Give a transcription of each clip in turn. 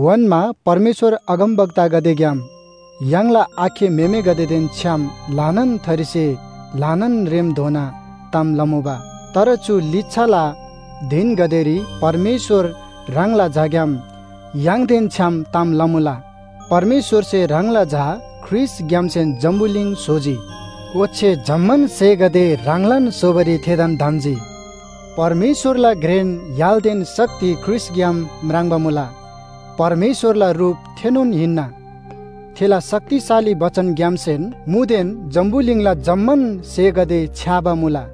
ओन्‍मा परमेश्‍वर अगमवक्तागदेग्‍याम य्‍हाङला आखे म्‍हेमेगदेदेन छ्‌याम ल्‍हानान थरीसे ल्‍हानान रेमधोना ताम लमुबा। तर चु लिच्‍छाला धिनगदेरी परमेश्‍वर ह्राङला झाग्‍याम य्‍हाङदेन छ्‌याम ताम लमुला। परमेश्‍वरसे ह्राङला झा ख्रीष्‍टग्‍यामसेन जम्‍बुलिङ स्‍होजी। ओच्‍छे जम्‍मान स्‍हेगदे ह्राङलान स्‍होबारी थेदान धम्‍जी। परमेश्‍वरला घ्रेन य्‍हालदेन शक्ति ख्रीष्‍टग्‍याम म्राङ्बा मुला। परमेश्‍वरला रुप थेनोन हिन्‍ना। थेला शक्तिशाली बचनग्‍यामसेन मुदेन जम्‍बुलिङला जम्‍मान स्‍हेगदे छ्‌याबा मुला।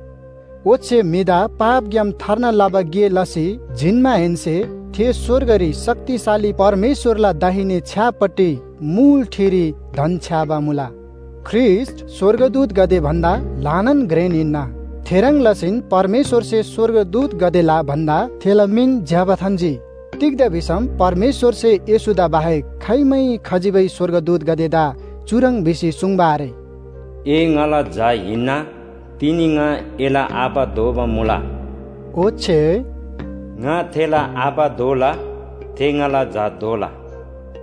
ओच्‍छे म्‍हिदा पापग्‍याम थार्ना लबा गे लसी जिन्‍माहेन्‍से थे स्‍वर्गरी शक्तिशाली परमेश्‍वरला दाहिने छ्‌यापट्टि मुल ठिरी धन्‍छ्‌याबा मुला। ख्रीष्‍ट स्‍वर्गदूतगदे भन्‍दा ल्‍हानान घ्रेन हिन्‍ना, थेह्रङ् लसीन परमेश्‍वरसे स्‍वर्गदूतगदेला भन्‍दा थेला मिन ज्‍यबा थान्‍जी। तिग्‍दा भिसम परमेश्‍वरसे येशूदा बाहेक खाइमै खजिबै स्‍वर्गदूतगदेदा चुह्रङ् भिसी सुङ्बा आरे, “ए ङाला झा हिन्‍ना, तिनी ङा एला आबा दोबा मुला” ओच्‍छे “ङा थेला आबा दोला, थे ङाला झा दोला।”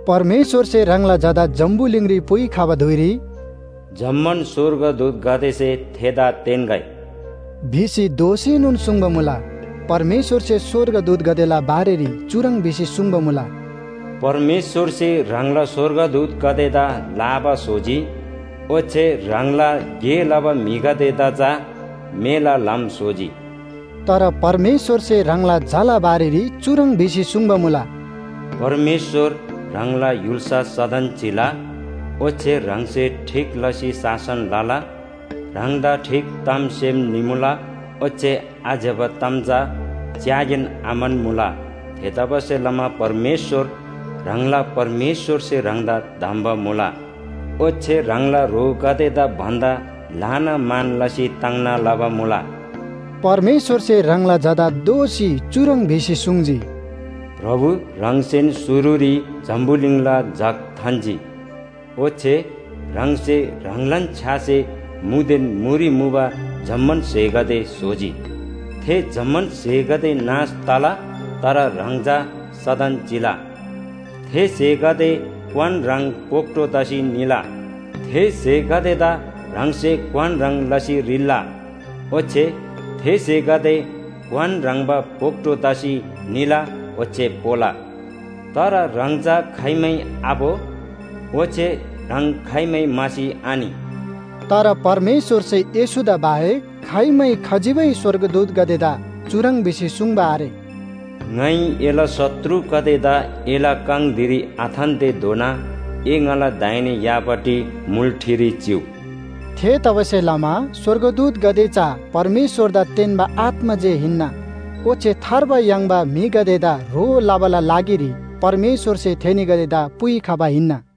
परमेश्‍वरसे ह्राङला झादा जम्‍बुलिङरी पुइखबा धुइरी “जम्‍मान स्‍वर्गदूतगदेसे थेदा तेन्‍गै” भिसी दोःसीनोन सुङ्बा मुला। परमेश्‍वरसे स्‍वर्गदूतगदेला बारेरी चुह्रङ् भिसी सुङ्बा मुला, “परमेश्‍वरसे ह्राङला स्‍वर्गदूतगदेदा लाबा स्‍होजी, ओच्‍छे ह्राङला गे लबा म्‍हिगदेदा चा मेला ल्‍हाम स्‍होजी।” तर परमेश्‍वरसे ह्राङला झाला बारेरी चुह्रङ् भिसी सुङ्बा मुला, “परमेश्‍वर ह्राङला य्‍हुल्‍सा सदन चिला। ओच्‍छे ह्राङसे ठीक लसी शासन लला। ह्राङदा ठीक ताम सेम निमुला, ओच्‍छे आज्‍यबा ताम चा च्‍यागेन आम्‍हन्‍मुला। थेतबासेलमा परमेश्‍वर, ह्राङला परमेश्‍वरसे ह्राङदा धम्‍बा मुला। ओच्‍छे ह्राङला ह्रोगदेदा भन्‍दा ल्‍हाना मान लसी ताङ्ना लबा मुला।” परमेश्‍वरसे ह्राङला झादा दोःसी चुह्रङ् भिसी सुङ्जी, “प्रभु, ह्राङसेन शुरुरी जम्‍बुलिङला जग थान्‍जी। ओच्‍छे ह्राङसे ह्राङलान छ्‌यासे मुदेन मुरी मुबा जम्‍मान स्‍हेगदे स्‍होजी। थे जम्‍मान स्‍हेगदे नाश तला, तर ह्राङ चा सदन चिला। थे स्‍हेगदे क्‍वान ह्रङ् भोक्‍टो तसी निला। थे स्‍हेगदेदा ह्राङसे क्‍वान ह्रङ् लसी रिल्‍ला, ओच्‍छे थे स्‍हेगदे क्‍वान ह्रङ्‌बा भोक्‍टो तसी निला ओच्‍छे पोला, तर ह्राङ चा खाइमै आपो। ओच्‍छे ह्राङ खाइमै म्‍हासी आनि।” तर परमेश्‍वरसे येशूदा बाहेक खाइमै खजिबै स्‍वर्गदूतगदेदा चुह्रङ् भिसी सुङ्बा आरे, “ङाइ एला शत्रुगदेदा एला काङ धिरी आथान्‍तेधोना ए ङाला दाहिने यापट्टि मुल ठिरी चिउ।” थेतबासेलमा स्‍वर्गदूतगदे चा परमेश्‍वरदा तेन्‍बा आत्‍मा जे हिन्‍ना। ओच्‍छे थार्बा याङ्बा म्‍हिगदेदा ह्रो लबाला लागिरी परमेश्‍वरसे थेनीगदेदा पुइखबा हिन्‍ना।